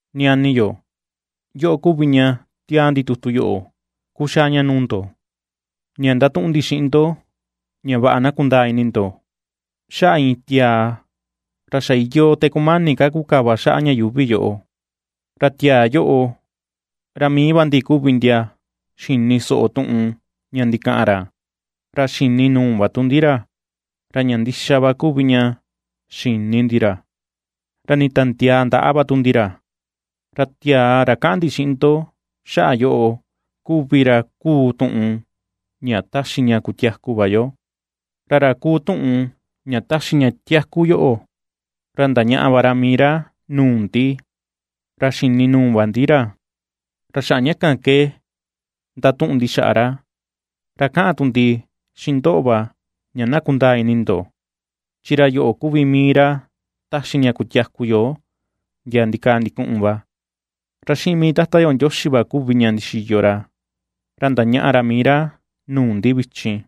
Ñani yo, yoꞌo kuvi ña ^tiaa ndi tutu yoꞌo kuxaa ña nuu ndo, ña ndatuꞌun ndi xiꞌin ndo ña vaꞌa na kundaa ini ndo xaꞌa iin tiaa ra xa iyoo te kumani ka kukava xaꞌa ña yuuvi yoꞌo. Ra tiaa yoꞌo, ra mii va ndi kuvi ndia xini soꞌo tuꞌun ña ndikaꞌan ra, ra xini nuu va tu ndi ra; ra ña ndixa va kuvi ña xini ndi ra, ra nitandiaa ndaꞌa va tu ndi ra. Ra tiaa, ra kaꞌan ndi xiꞌin ndo xaꞌa yoꞌo kuvi ra kuu tuꞌun ña taxi ña kutiaku va yo. Ra ra kuu tuꞌun ña taxi ña tiaku yoꞌo, ra ndañaꞌa va ra mii ra nuu ndi, ra xini nuu va ndi ra, ra xaꞌa ña kan ke ^ndatuꞌun ndi xaꞌa ra, ra kaꞌan tu ndi xiꞌin ndoꞌo va ña vaꞌa na kundaa ini ndo, chi ra yoꞌo kuvi mii ra taxi ña kutiaku yo ndia ndikaa ndikuꞌun va, ra xiꞌin mii Tata yo Ndioxi va kuvi ña ndixiyo ra. Ra ndañaꞌa ra mii ra nuu ndi vichin.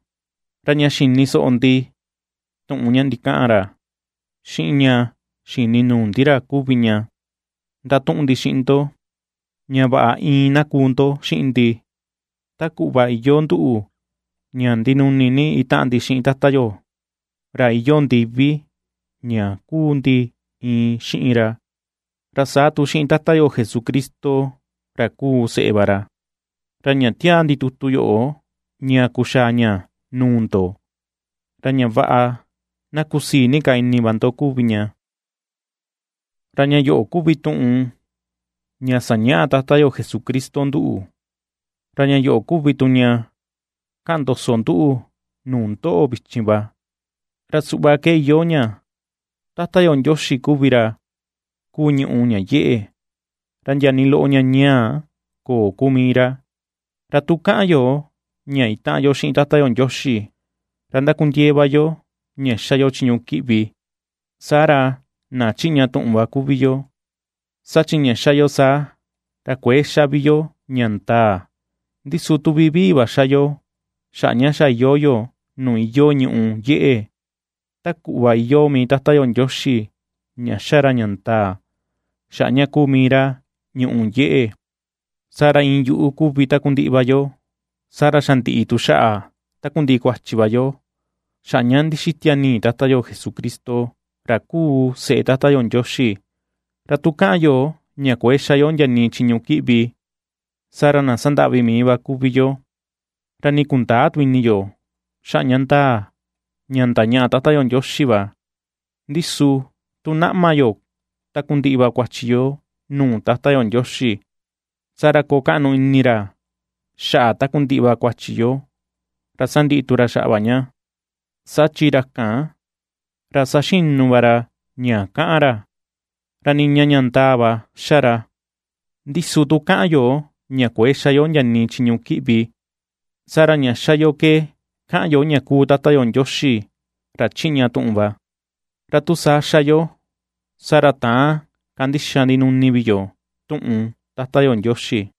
Ra ña xini soꞌo ndi tuꞌun ña ndikaꞌan ra, xiꞌin ña xini nuu ndi ra kuvi ña ndatuꞌun ndi xiꞌin ndo, ña vaꞌa iin na kuu ndo xiꞌin ndi, ta kuꞌva iyoo nduꞌu ña ndinuni ni itaꞌan ndi xiꞌin Tata yo, ra iyoo ndivi ña kuu ndi iin xiꞌin ra, ra saa tu xiꞌin Tata yo Jesucristo ra kuu seꞌe va ra. Ra ña ^tiaa ndi tuꞌun yoꞌo ña kuxaa ña nuu ndo, ra ña vaꞌa na kusii ni ka ini va ndo kuvi ña. Ña yoꞌo kuvi tuꞌun ña sañaꞌa Tata yo Jesucristo nduꞌu, ra ña yoꞌo kuvi tu ña kaꞌan ndoso nduꞌu nuu ndoꞌo vichin va, ra suꞌva ke iyoo ña: Tata yo Ndioxi kuvi ra kuu ñùꞌù ña yeꞌe, ra ndia nii loꞌo ña ñaa köo kuu mii ra. Ra tu kaꞌan yo ña itaꞌan yo xiꞌin Tata yo Ndioxi, ra ndakundiee ka va yo ña xa yo chiñu kiꞌvi, saa ra na chiꞌña tuꞌun va kuvi yo, saa chi ña ^xa yo saa, ra kuëe ^xa vi yo ña ndaa. Ndi su tu vivii va ^xa yo, xaꞌa ña xa iyoo yo nuu iyoo ñùꞌù yeꞌe, ta kuꞌva iyoo mii Tata yo Ndioxi ña ^xa ra ña ndaa, xaꞌa ña kuu mii ra ñùꞌù yeꞌe, saa ra iin yuꞌu kuvi takundiꞌi va yo, saa ra xa ndiꞌi tu xaꞌa takundiꞌi kuachi va yo xaꞌa ña ndixitia nii Tata yo Jesucristo, ra kuu seꞌe Tata yo Ndioxi. Ra tu kaꞌan yo ña kuëe xa yo ndia nii chiñu kiꞌvi, saa ra na sandaꞌvi mii va kuvi yo, ra nii kundäa tu ini yo xaꞌa ña ndaa ña ndañaꞌa Tata yo Ndioxi va. Ndi su tu naꞌma yo takundiꞌi va kuachi yo nuu Tata yo Ndioxi, saa ra koo kaꞌnu ini ra xaꞌa takundiꞌi va kuachi yo, ra sandiꞌi tu ra xaꞌa va ña, saa chi ra kan, ra saxinu va ra ña kaꞌan ra, ra niña ña ndaa va ^xa ra. Ndi su tu kaꞌan yo ña kuëe xa yo ndia nii chiñu kiꞌvi, saa ra ña ^xa yo ke kaꞌan yo ña kuu Tata yo Ndioxi, ra chiꞌña tuꞌun va, ra tu saa ^xa yo, saa ra täan kandixa ndinuni vi yo tuꞌun Tata yo Ndioxi.